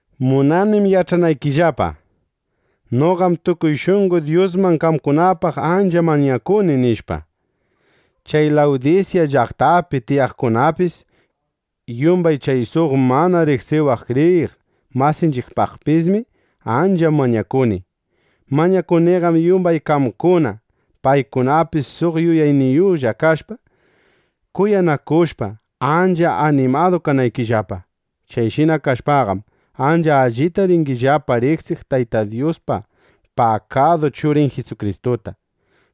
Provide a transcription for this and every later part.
Munanim yach'anaykillapa: Noqam tukuy shunqo Dyusman qamkunapaq ancha mañakuni, nishpa. Chay Lawdisya llaqtapi tiyaqkunapaqpis, yumbay chay suq mana riqsiwaq kriyiq masinchiqpaqpismi ancha mañakuni. Mañakuniqam yumbay qamkuna, paykunapis suq yuyayniyuqlla kashpa, kuyanakushpa, ancha animadu kanaykillapa. Chayshina kashpaqam, ancha allita ringillapa riqsiq Tayta Dyuspa pakadu Churin Jisukristuta.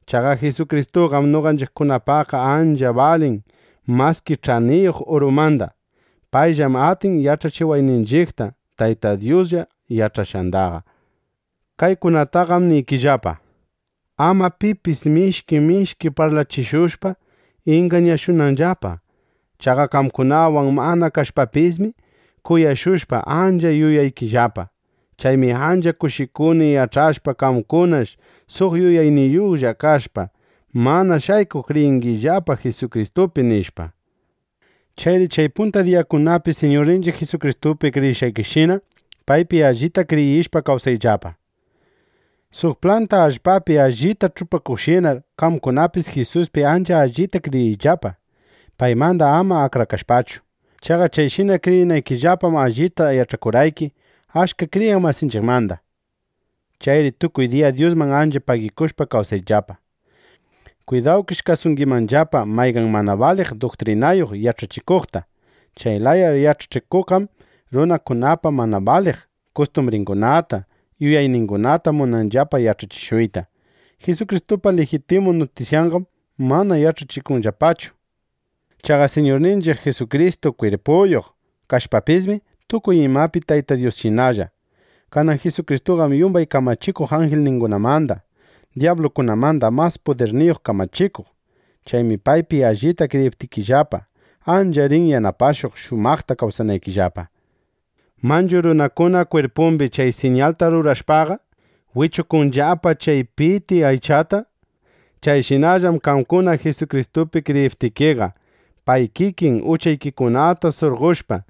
Chaqa Jisukristuqam noqanchiqkunapaqqa ancha balin maski ch'aniyuq urumanda. Payllam atin yach'achiwayninchiqta Tayta Dyuslla yach'ashqandaqa. Kaykunataqam niykillapa, ama pipis, mishki mishki parlachishushpa, ingañashunanllapa. Chaqa qamkunawan mana kashpapismi, kuyashushpa, ancha yuyaykillapa. Chaymi ancha kushikuni yach'ashpa: Qamkunash suq yuyayniyuqlla kashpa, mana shaykuq kriyingillapa Jisukristupi, nishpa. Chayri chay punta diyakunapi Siñurninchiq Jisukristupi kriyishqaykishina, paypi allita kriyishpa, kawsayllapa. Suq planta allpapi allita ch'upakuqshinar qamkunapis Jisuspi ancha allita kriyiyllapa, paymanda ama akrakashpachu. Chaqa chayshina kriyinaykillapam allita yach'akurqayki achka kriyiq masinchiqmanda. Chayri tukuy diya Dyusman ancha pagikushpa kawsayllapa. Kwidawkish kasungimanllapa mayqan mana baliq duktrinayuq yach'achikuqta. Chay laya yach'achikuqqam runakunapa mana baliq kustumbringunata, yuyayningunata munanllapa yach'achishuyta. Jisukristupa lijitimu nutisyandaqam mana yach'achikunllapachu. Chaqa Siñurninchiq Jisukristu kwirpuyuq kashpapismi, tukuy imapi Tayta Dyusshinalla. Kanan Jisukristuqam yumbay kamachikuq anjilkunamanda, dyablukunamanda mas pudirniyuq kamachikuq. Chaymi paypi allita kriyiptikillapa, ancha rin yanapashuq, shumaqta kawsanaykillapa. Manchu runakuna kwirpumbi chay siñalta rurashpaqa, wichukunllapa chay piti aychata. Chayshinallam qamkuna Jisukristupi kriyiptikiqa, pay kikin uchaykikunata surqoshpa,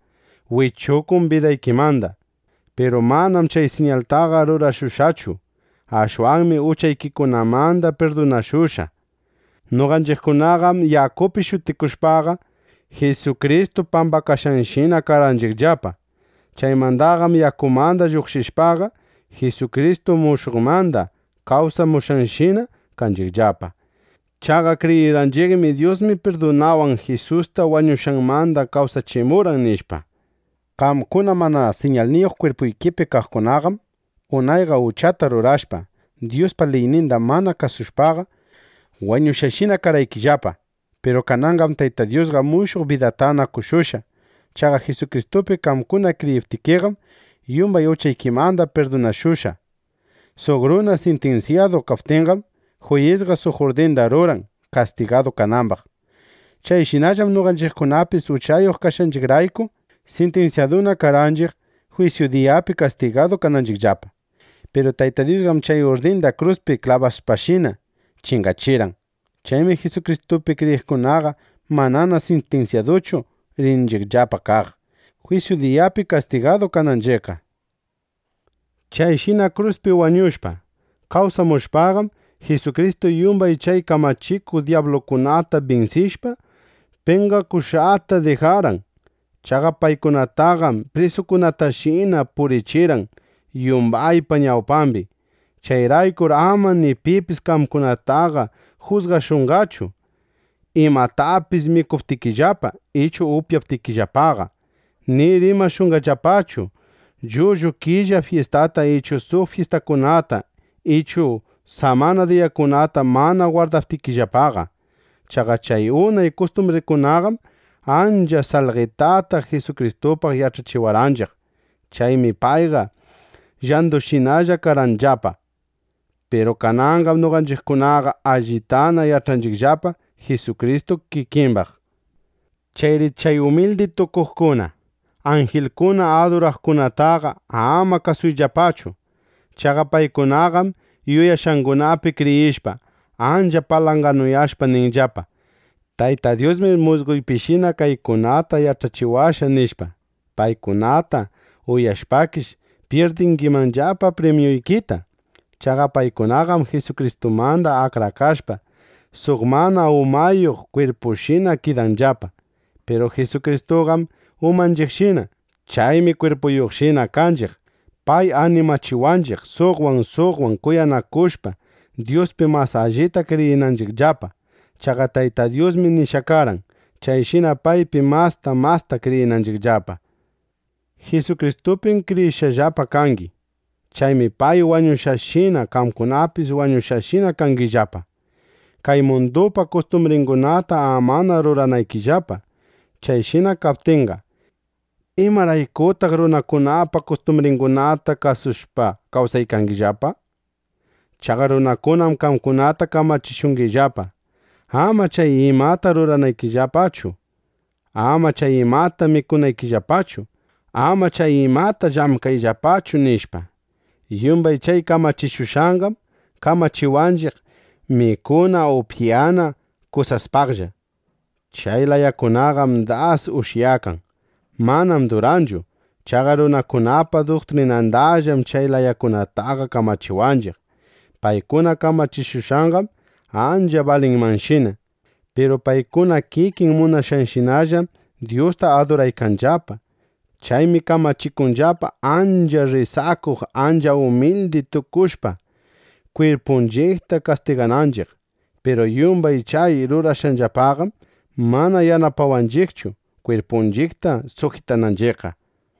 wichukun bidaykimanda. Piru manam chay siñaltaqa rurashushqachu. Ashwanmi uchaykikunamanda pirdunashushqa. Noqanchiqkunaqam yakupi shutikushpaqa, Jisukristu pambakashqanshina karqanchiqllapa. Chaymandaqam yakumanda lluqshishpaqa, Jisukristu mushuqmanda kawsamushqanshina kanchiqllapa. Chaqa kriyirqanchiqmi: Dyusmi pudirninwan Jisusta wañushqanmanda kawsachimurqan, nishpa. Qamkuna mana siñalniyuq kwirpuykipi kaqkunaqam unayqa uchata rurashpa, Dyuspa liyninda mana kasushpaqa, wañushqashina karqaykillapa. Piru kananqam Tayta Dyusqa mushuq bidatana qoshushqa. Chaqa Jisukristupi qamkuna kriyiptikiqam, yumbay uchaykimanda pirdunashushqa. Suq runa sintinsyadu kaptinqam, juyisqa suq urdinda ruran, kastigadu kanambaq. (Chayshinallam noqanchiqkunapis uchayuq kashqanchiqrayku sintinsyaduna karqanchiq, jwisyu diyapi kastigadu kananchiqllapa.) Piru Tayta Dyusqam chay urdinda kruspi klabashpashina chingachirqan. Chaymi Jisukristupi kriyiqkunaqa manana sintinsyaduchu rinchiqllapa kaq, jwisyu diyapi kastigadu kananchiqqa. Chayshina kruspi wañushpa, kawsamushpaqam, Jisukristu yumbay chay kamachikuq dyablukunata binsishpa, penqakushqata dijarqan. Chaqa paykunataqam prisukunatashina purichirqan yumbaypa ñawpambi. Chayraykur ama ni pipis qamkunataqa jusgashunqachu, imatapis mikuptikillapa, ichu upyaptikillapaqa; ni rimashunqallapachu llullu killa fyistata ichu suq fyistakunata ichu samana diyakunata mana gwardaptikillapaqa. Chaqa chay unay kustumbringunaqam ancha salqetata Jisukristupaq yach'achiwarqanchiq. Chaymi paypa llandunshinalla karqanllapa. Piru kananqam noqanchiqkunaqa allitana yach'anchiqllapa Jisukristu kikimbaq. Chayri chay umildi tukuqkunata, anjilkuna aduraqkunataqa ama kasuyllapachu. Chaqa paykunaqam yuyashqangunapi kriyishpa, ancha palanganuyashpa, ninllapa: “Tayta Dyusmi musqoypishina kaykunata yach'achiwashqa”, nishpa. Paykunata uyashpakish, pyirdingimanllapa primyuykita. Chaqa paykunaqam Jisukristumanda akrakashpa, suq mana umayuq kwirpushinana kidanllapa. Piru Jisukristuqam umanchiqshina. Chaymi kwirpunshina kaptinchiq, pay animachiwanchiq, suqwan suqwan kuyanakushpa, Dyuspi mas allita kriyinanchiqllapa. Chaqa Tayta Dyusmi nishqa karqan, chayshina paypi masta masta kriyinanchiqllapa. Jisukristupim kriyishqallapa kangi. Chaymi pay wañushqanshina, qamkunapis wañushqashinana kangillapa, kay mundupa kustumbringunata amana ruranaykillapa. Chayshina kaptinqa, ¿imaraykutaq runakunapa kustumbringunata kasushpa kawsangillapaqa? Chaqa runakunam qamkunata kamachishungillapa: “¡Ama chay imata rurayllapachu! ¡Ama chay imata mikuyllapachu! ¡Ama chay imata llamkayllapachu!” nishpa. Yumbay chay kamachishushqanqam kamachiwanchiq mikuna upyana kusaspaqlla. Chay layakunaqam das ushyakan. Manam duranchu. Chaqa runakunapa duktrinanmandallam chay layakunataqa kamachiwanchiq. Paykuna kamachikushqanqam ancha balinmanshina. Piru paykuna kikin munashqanshinallam Dyusta aduraykanllapa. Chaymi kamachikunllapa, ancha rrisakuq, ancha umildi tukushpa, kwirpunchiqta kastigananchiq. Piru yumbay chay rurashqanllapaqam mana yanapawanchiqchu, kwirpunchiqta sujitananchiqqa.